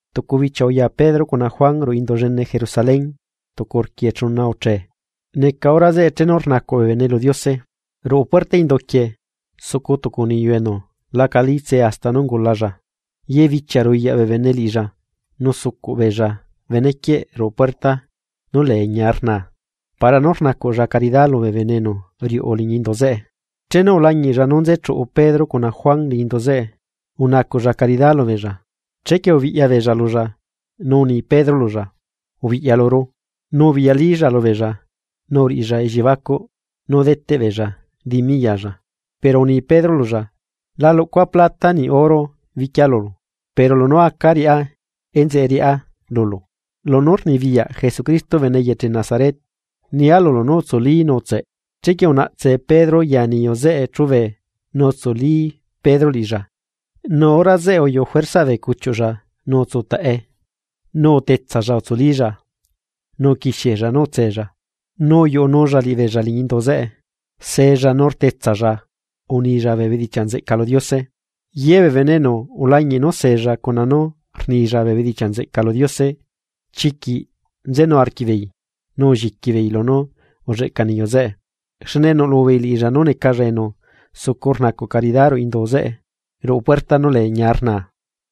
Tucu bichia uya Pedro cuna Juan ruꞌu Indu llene Jerusalén tucu rquiechuna uchee, neca hora zeꞌe chenu rnacuꞌ bee bene lu Diose. Ruꞌu puerta indu quieꞌ, sucu tucu niyu enu lacalitse hasta nú ungulalla. Ye bichia ruyaꞌ bee bene liꞌilla nu sucuꞌ beella bene quieꞌ ruꞌu puerta nú lee ñia rnaa para nú rnacuꞌlla caridá lubee bene enu riuꞌu liñi indu zeꞌe. Chenu ulañiꞌlla nú nzechuꞌu Pedro cuna Juan liñi indu zeꞌe, unacuꞌlla caridá lubeella. Chequie ubiꞌya beella lulla, nu uni Pedro lulla: ―Ubiꞌya luru. Nu ubiꞌyalílla lubeella nu uriꞌilla elliebacuꞌ nú deteꞌ beella dimi yalla. Pero uni Pedro lulla: ―La luꞌcua plata niꞌ oro biquia lulu, pero lunú aca riꞌá enzeꞌe riꞌá lulu: lunú rnibiyaꞌ Jesucristo bene eyeche Nazaret, nia lulu nú utsuli nu utseꞌ. Chequie unaꞌtse Pedro ya niyu zeꞌe chúbe nu utsuli Pedro liꞌilla, nu hora zeꞌe uyuꞌu Juerzaꞌ bee cuchiuꞌlla nu utsutaꞌe. Nu utetsalla utsulílla, nu uquixiella nú utsella, uyuꞌunulla liꞌibeella liñi indu zeꞌe. Sella nu rtetsalla unilla bee bedichiaꞌ nzeꞌca lu Diose. Ye bee bene enu ulañiꞌ nú sella cuna nú rnilla bee bedichiaꞌ nzeꞌca lu Diose, chiquiꞌ nzenu arquiꞌbeei nu ulliqui beei lunú ulleꞌca niyu zeꞌe, xne nuꞌlubeei liꞌilla nú necalla enu sucu rnacuꞌ caridá ruꞌu indu zeꞌe, ruꞌu puerta nú lee Ñia rnaa.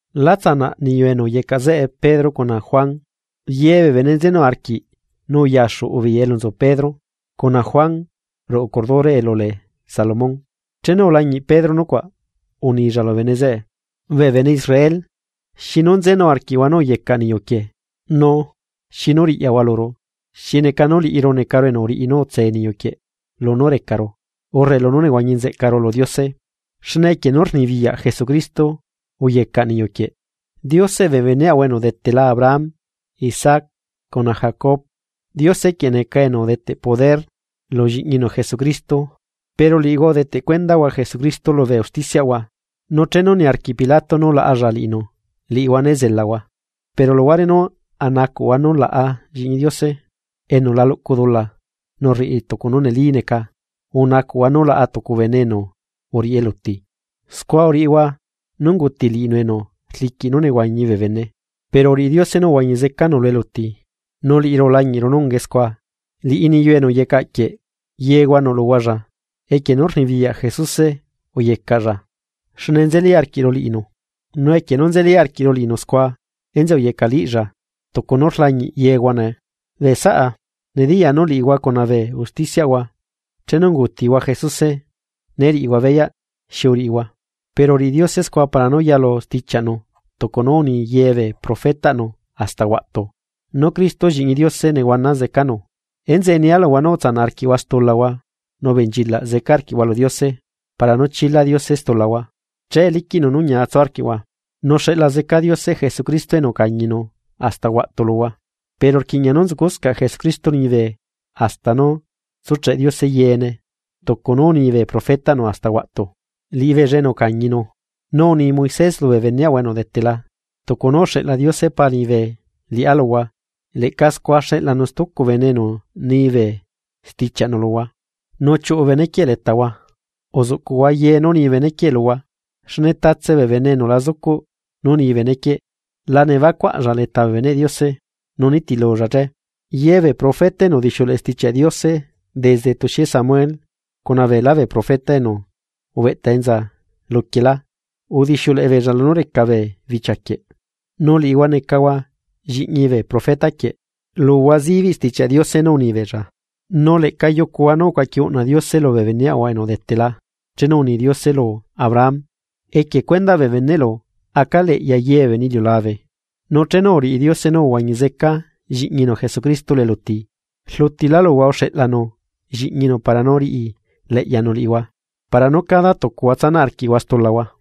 La tsanaꞌ niyu enu uyecaꞌ zeꞌe Pedro cuna Juan, ye bee bene nzenu arquiꞌ nu uyaxuꞌu beei elu nzu Pedro cuna Juan ruꞌu cordure elu lee Salomón. Chenu ulañiꞌ Pedro nucuaꞌ, unilla lubee bene zeꞌe: ―Bee bene Israel, ¿xinu nzenu arquiꞌhua nú uyecaꞌ niyuquieꞌ?, nu ¿xinu riꞌyahua luru, xi neca nú liꞌiru necaru enu uriꞌi nú utse niyu quieꞌ, lunú recaru, urre lunú nehuañi nzeꞌcaru lu Diose? Xne equie nú rnibiyaꞌ Jesucristo uyecaꞌ niyu quieꞌ. Dioseꞌ bee beneꞌahua enu udetela Abraham, Isaac cuna Jacob, Diose quieꞌ neca enu udeteꞌ poder lu Lliꞌñinu Jesucristo, pero liꞌihua udeteꞌ cuendahua Jesucristo lubee usticiaꞌhua. Nu chenu niarquiꞌ Pilato nú laꞌalla liꞌinu liꞌihua né zelahua. Pero luhuare nú anacuꞌhua nú laꞌa Lliꞌñi Diose enu la luꞌcu dula nu rriꞌi tucu nú neli neca, unacuꞌhua nú laꞌa tucu bene enu uriꞌi eluti. Scua uriꞌihua nú unguti liꞌinu enu rliquiꞌ nú nehuañi bee bene. Pero uriꞌi Diose nú uhuañi zecanu lu eluti, nu liꞌiru ulañiꞌru nú ungae scua. Liꞌi niyu enu uyecaꞌ quieꞌ yehua nuꞌluhualla, nu equie nú rnibiyaꞌ Jesuse uyecaꞌlla xne nzeli arquiꞌru liꞌinu. Nu equie nú nzeli arquiꞌru liꞌinu scua, enzeꞌe uyecaꞌliꞌlla tucu nú rlañiꞌ yehua nee. ’Bee saꞌa, nediyaa nú liꞌihua cuna bee usticiaꞌhua chenu ungutihua Jesuse né riꞌihua beyaꞌ xi uriꞌihua. Pero uriꞌi Diose scua para nú yalu stichiaꞌnu tucu nú uni ye bee profetaꞌnu hasta huaꞌtu. Nú Cristo Lliꞌñi Diose nehuana zecanu. Enzeꞌe nia luhua nú utsanaꞌ arquiꞌhua stulahua nu ubenchilaꞌ zeca arquiꞌhua lu Diose para nú chila Diose stulahua. Che liquiꞌnu nú ñia tsu arquiꞌhua. Nu xeꞌla zeca Diose Jesucristo enu ucañinu hasta huaꞌtu luhua. Pero rquiꞌña nú nzucuscaꞌ Jesucristo liñibe hasta nú tsucheꞌ Diose yeene tucu nú uni bee profetaꞌnu hasta huaꞌtu. Liꞌibeella enu ucañinu. Nu uni Moisés lubee beneꞌahua enu udetela: “Tucu nú uxeꞌla Diose Pa liñibe liꞌá luhua leꞌca scua xeꞌlanu stucu bene enu ni bee stichiaꞌnu luhua, nu chiuꞌu bene quieꞌ letahua. Uzuꞌcuꞌhua ye nú ni bene quieꞌ luhua, xne tatse bee bene enu la zucuꞌ nú ni bene quieꞌ la nebacuaꞌlla leta bee beneꞌ Diose, nu nitilulla che.” ’Ye bee profeta enu udixiuleꞌe Stichiaꞌ Diose desde tuxie Samuel cuna beelá bee profeta enu ubeꞌta enza luquiela, udixiuleꞌe beella lunú reca bee bichia quieꞌ. Nu liꞌihua necahua lliꞌñi bee profeta quieꞌ. Luhua zibiꞌ Stichiaꞌ Diose nú unibeella, nu leꞌca yucuhua nú ucuaqui uꞌna Diose lubee beneꞌahua enu udetela chenu uni Diose lu Abraham: “Equie cuendaꞌ bee beneꞌlu aca leꞌya ye bee bene lu iliulabe.” Nu chenu uriꞌi Diose nú uhuañi zeca Lliꞌñinu Jesucristo lu eluti, rlutilá luhua uxeꞌlanu Lliꞌñinu para nú riꞌileꞌyanu liꞌihua para nú cada tucuahua tsanaꞌ arquiꞌhua stulahua.